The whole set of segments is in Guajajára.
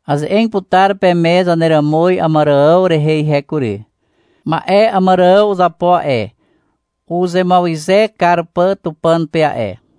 Aze'eg putar peme zaneràmuz Àmàrààw rehe ihe kury. Ma'e Àmàrààw uzapo a'e, uzemuawyze kar pà Tupàn pe a'e.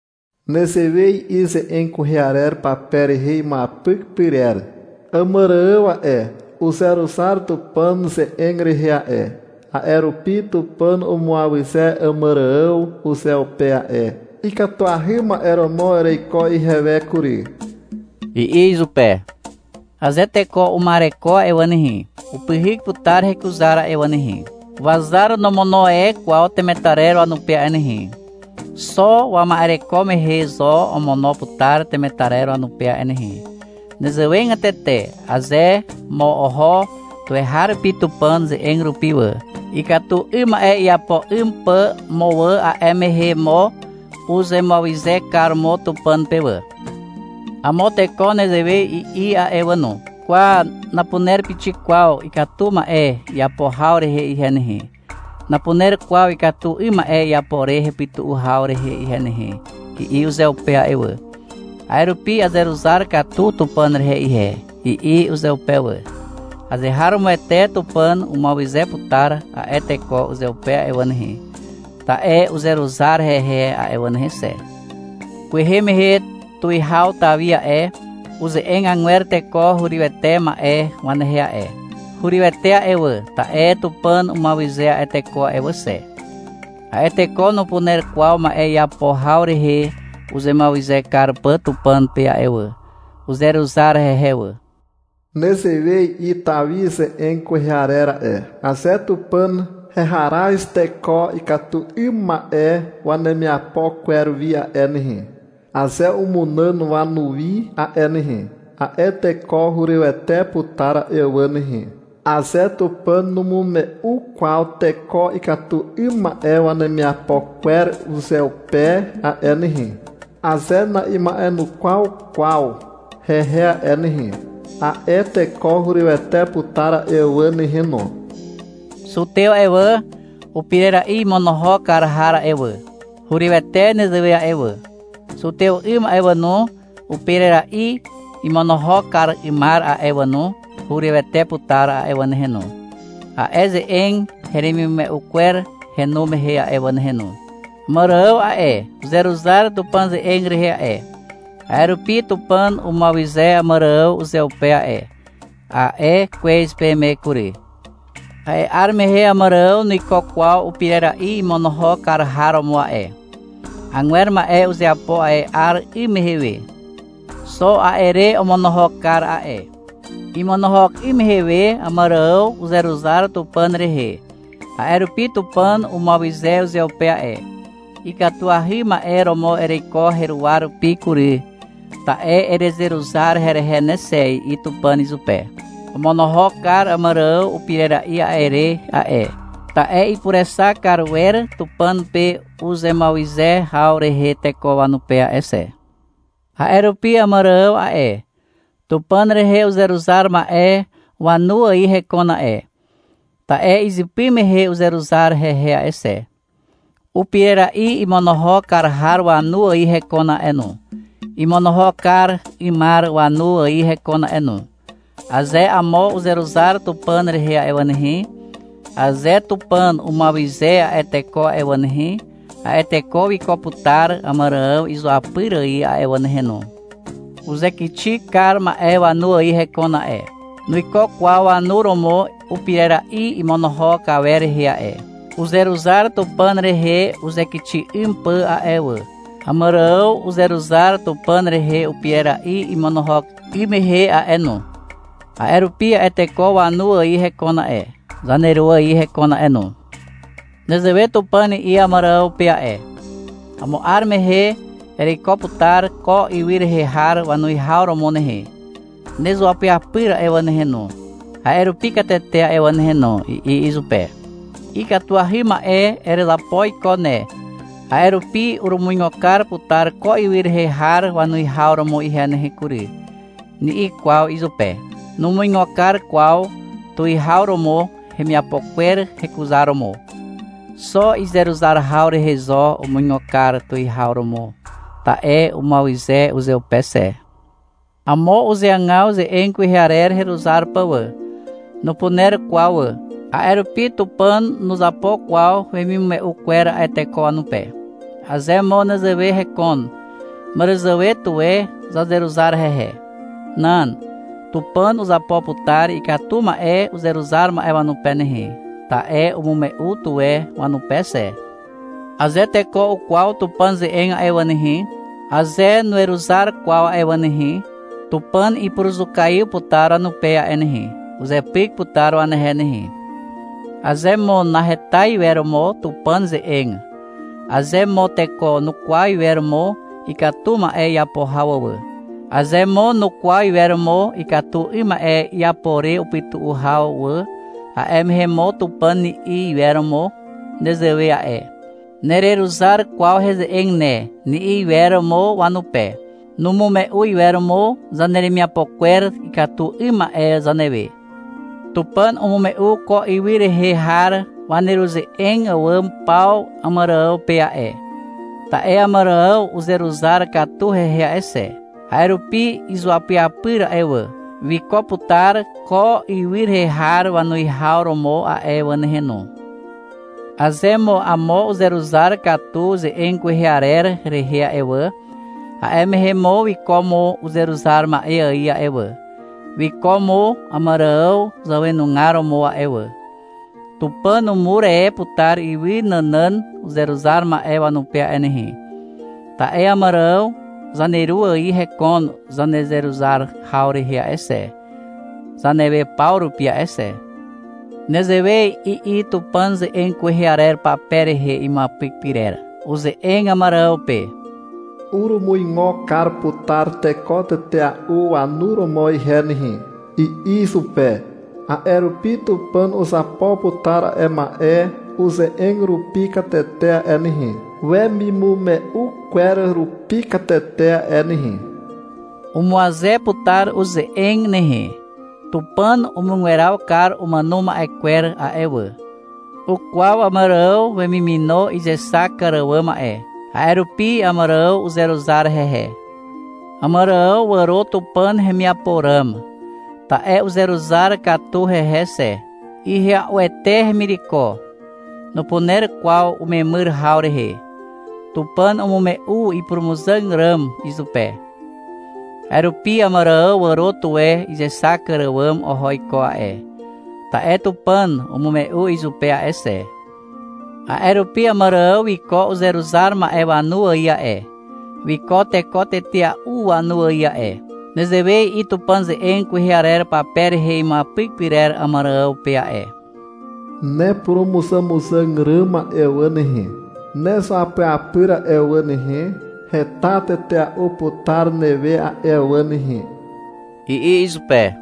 Nezewe i'i ze'eg kwehe arer pape rehe imuapyk pyrer. — Àmàrààw a'e, uzeruzar Tupàn ze'eg rehe a'e, a'e rupi Tupàn umuawyze Àmàrààw uzeupe a'e. — Ikatuahy ma'e romo ereiko ihewe kury, i'i izupe. Aze teko uma'ereko a'e wà nehe, upyhyk putar hekuzar a'e wà nehe. Wazar nomono e kwaw temetarer wanupe a'e nehe. Xo wama'ereko mehe zo omono putar temetarer wanupe a'e nehe. Nezewegatete aze mo oho tuweharupi Tupàn ze'eg rupi wà, ikatu 'ym ma'e iapo 'ym pà mo wà, a'e mehe mo uzemuawyze kar mo Tupàn pe wà. Amo teko nezewe i'i a'e wà no. — Kwa, napuner pixik kwaw ikatu ma'e iapo haw rehe ihe nehe, napuner kwaw ikatu 'ym ma'e iapo re hepytu'u haw rehe ihe nehe, i'i uzeupe a'e wà. — A'e rupi azeruzar katu Tupàn rehe ihe, i'i uzeupe wà. Azeharomoete Tupàn umuawyze putar a'e teko uzeupe a'e wà nehe, ta'e uzeruzar hehe a'e wà nehe xe. Kwehe mehe tuwihaw Tawi a'e, uze'eg agwer teko hurywete ma'e wanehe a'e. Hurywete a'e wà, ta'e Tupàn umuawyze a'e teko a'e wà xe. A'e teko nupuner kwaw ma'e iapo haw rehe uzemuawyze kar pà Tupàn pe a'e wà. Uzeruzar hehe wà. Nezewe i'i Tawi ze'eg kwehe arer a'e. — Aze Tupàn heharaz teko ikatu 'ym ma'e wanemiapo kwer wi a'e nehe, aze umunàn wanuwi a'e nehe, a'e teko hurywete putar a'e wà nehe. Aze Tupàn numume'u kwaw teko ikatu 'ym ma'e wanemiapo kwer uzeupe a'e nehe, aze na'ima'enukwaw kwaw hehe a'e nehe, a'e teko hurywete putar a'e wà nehe no. Zutew a'e wà, upirera'i imonohok kar har a'e wà, hurywete nezewe a'e wà. Zutew 'ym a'e wà no, upirera'i imonohok kar 'ymar a'e wà no, hurywete putar a'e wà nehe no, a'e ze'eg heremimume'u kwer henu mehe a'e wà nehe no. Àmàrààw a'e, uzeruzar Tupàn ze'eg rehe a'e, a'e rupi Tupàn umuawyze Àmàrààw uzeupe a'e, a'e kwez peme kury. A'e 'ar mehe Àmàrààw nuiko kwaw upirera'i imonohok kar har romo a'e. Agwer ma'e uzeapo a'e 'ar 'ym mehe we. Xo a'e re omonohok kar a'e. Imonohok 'ym mehe we, Àmàrààw uzeruzar Tupàn rehe, a'e rupi Tupàn umuawyze uzeupe a'e. — Ikatuahy ma'e romo ereiko heruwa rupi kury, ta'e erezeruzar herehe ne xe, i'i Tupàn izupe. Omonohok kar Àmàrààw upirera'i a'e re a'e, ta'e ipurexak kar wer Tupàn pe uzemuawyze haw rehe teko wanupe a'e xe. A'e rupi Àmàrààw a'e, Tupàn rehe uzeruzar ma'e wanu ài hekon a'e, ta'e izypy mehe uzeruzar hehe a'e xe. Upirera'i imonohok kar har wanu ài hekon a'e no, imonohok kar 'ymar wanu ài hekon a'e no. Aze amo uzeruzar Tupàn rehe a'e wà nehe, aze Tupàn umuawyze a'e teko a'e wà nehe, a'e teko wiko putar Àmàrààw izuapyr ài a'e wà nehe no. Uzekixi kar ma'e wanu ài hekon a'e. Nuiko kwaw wanu romo upirera'i imonohok awer rehe a'e. Uzeruzar Tupàn rehe uzekixi 'ym pà a'e wà. Àmàrààw uzeruzar Tupàn rehe upirera'i imonohok 'ym mehe a'e no. A'e rupi a'e teko wanu ài hekon a'e, zaneru ài hekon a'e no. Nezewe Tupàn i'i Àmàrààw pe a'e. — Amo 'ar mehe ereiko putar ko ywy rehe har wanuwihaw romo nehe. Nezuapyapyr a'e wà nehe no, a'e rupi katete a'e wà nehe no, i'i izupe. — Ikatuahy ma'e erezapo iko ne, a'e rupi urumuigo kar putar ko ywy rehe har wanuwihaw romo ihe nehe kury, ni'i kwaw izupe. Numuigo kar kwaw tuwihaw romo hemiapo kwer hekuzaromo. Xo izeruzar haw rehe zo umuigo kar tuwihaw romo, ta'e umuawyze uzeupe xe. Amo uzeagaw ze'eg kwehe arer heruzar pà wà. Nupuner kwaw wà. A'e rupi Tupàn nuzapo kwaw wemimume'u kwer a'e teko wanupe. Aze mo nezewe hekon, màràzàwe tuwe zazeruzar hehe. Nan. Tupàn uzapo putar ikatu ma'e uzeruzar ma'e wanupe nehe, ta'e umume'u tuwe wanupe xe. Aze teko ukwaw Tupàn ze'eg a'e wà nehe, aze nuweruzar kwaw a'e wà nehe, Tupàn ipuruzukaiw putar wanupe a'e nehe. Uzepyk putar wanehe nehe. Aze mo naheta iwer mo Tupàn ze'eg, aze mo teko nukwaw iwer mo ikatu ma'e iapo haw wà, aze mo nukwaw iwer mo ikatu 'ym ma'e iapo re upytu'u haw wà, a'e mehe mo Tupàn ni'i iwer mo nezewe a'e. — Nereruzar kwaw heze'eg ne, ni'i iwer mo wanupe. Numume'u iwer mo zaneremiapo kwer ikatu 'ym ma'e zanewe. Tupàn umume'u ko ywy rehe har waneruze'eg àwàm paw Àmàrààw pe a'e, ta'e Àmàrààw uzeruzar katu hehe a'e xe. A'e rupi izuapyapyr a'e wà, wiko putar ko ywy rehe har wanuwihaw romo a'e wà nehe no. Aze mo amo uzeruzar katu ze'eg kwehe arer rehe a'e wà, a'e mehe mo wiko mo uzeruzar ma'e ài a'e wà, wiko mo Àmàrààw zàwenugar romo a'e wà. Tupàn umur e putar ywy nànàn uzeruzar ma'e wanupe a'e nehe. Ta'e Àmàrààw zaneru ài hekon zanezeruzar haw rehe a'e xe, zanewe paw rupi a'e xe. Nezewe i'i Tupàn ze'eg kwehe arer pape rehe imuapyk pyrer. Uze'eg Àmàrààw pe. — Urumuigo kar putar teko tetea'u wanu romo ihe nehe, i'i izupe. A'e rupi Tupàn uzapo putar a'e ma'e uze'eg rupi katete a'e nehe, wemimume'u kwer rupi katete a'e nehe. Umuaze putar uze'eg nehe. Tupàn umugweraw kar umàno ma'e kwer a'e wà. Ukwaw Àmàrààw wemimino izexak kar àwàm a'e. A'e rupi Àmàrààw uzeruzar hehe. Àmàrààw wàro Tupàn hemiapo ràm, ta'e uzeruzar katu hehe xe. Ihya'uete hemireko. Nupuner kwaw umemyr haw rehe. Tupàn umume'u ipurumuzàg ràm izupe. A'e rupi Àmàrààw wàro tuwe izexak kar àwàm oho iko a'e, ta'e Tupàn umume'u izupe a'e xe. A'e rupi Àmàrààw wiko uzeruzar ma'e wanu ài a'e, wiko teko tetea'u wanu ài a'e. Nezewe i'i Tupàn ze'eg kwehe arer pape rehe imuapyk pyrer Àmàrààw pe a'e. — Nepurumuzàmuzàg ràm a'e wà nehe, nezuapyapyr a'e wà nehe, heta tetea'u putar newe a'e wà nehe, i'i izupe.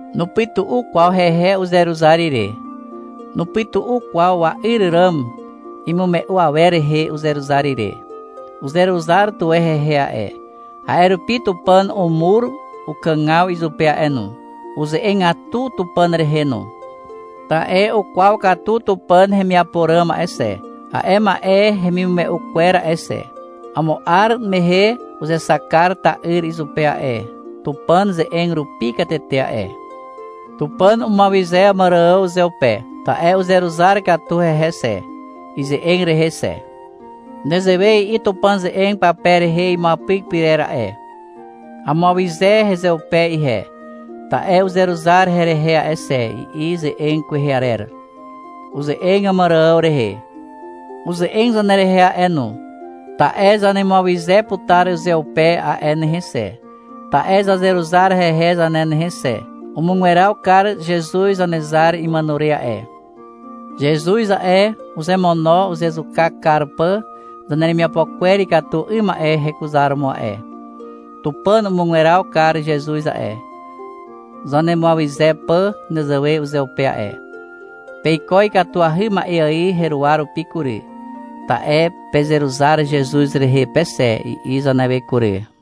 Nupytu'u kwaw hehe uzeruzar ire. Nupytu'u kwaw wa'yr ràm imume'u awer rehe uzeruzar ire. Uzeruzar tuwe hehe a'e, a'e rupi Tupàn umur ukàgaw izupe a'e no. Uze'egatu Tupàn rehe no. Ta'e ukwaw katu Tupàn hemiapo ràm a'e xe, a'e ma'e hemimume'u kwer a'e xe. Amo 'ar mehe uzexak kar ta'yr izupe a'e, Tupàn ze'eg rupi katete a'e. Tupàn umuawyze Àmàrààw uzeupe. Ta'e uzeruzar katu hehe xe, ize'eg rehe xe. Nezewe i'i Tupàn ze'eg pape rehe imuapyk pyrer a'e. — Amuawyze hezeupe ihe, ta'e uzeruzar herehe a'e xe, i'i ze'eg kwehe arer. Uze'eg Àmàrààw rehe. Uze'eg zanerehe a'e no. Ta'e zanemuawyze putar uzeupe a'e nehe xe, ta'e zazeruzar hehe zane nehe xe. Umugweraw kar Zezuz Zanezar imàno re a'e. Zezuz a'e, uzemono uzezuka kar pà zaneremiapo kwer ikatu 'ym ma'e hekuzaromo a'e. Tupàn umugweraw kar Zezuz a'e, zanemuawyze pà nezewe uzeupe a'e. — Peiko ikatuahy ma'e ài heruwa rupi kury, ta'e pezeruzar Zezuz rehe pe xe, i'i zanewe kury.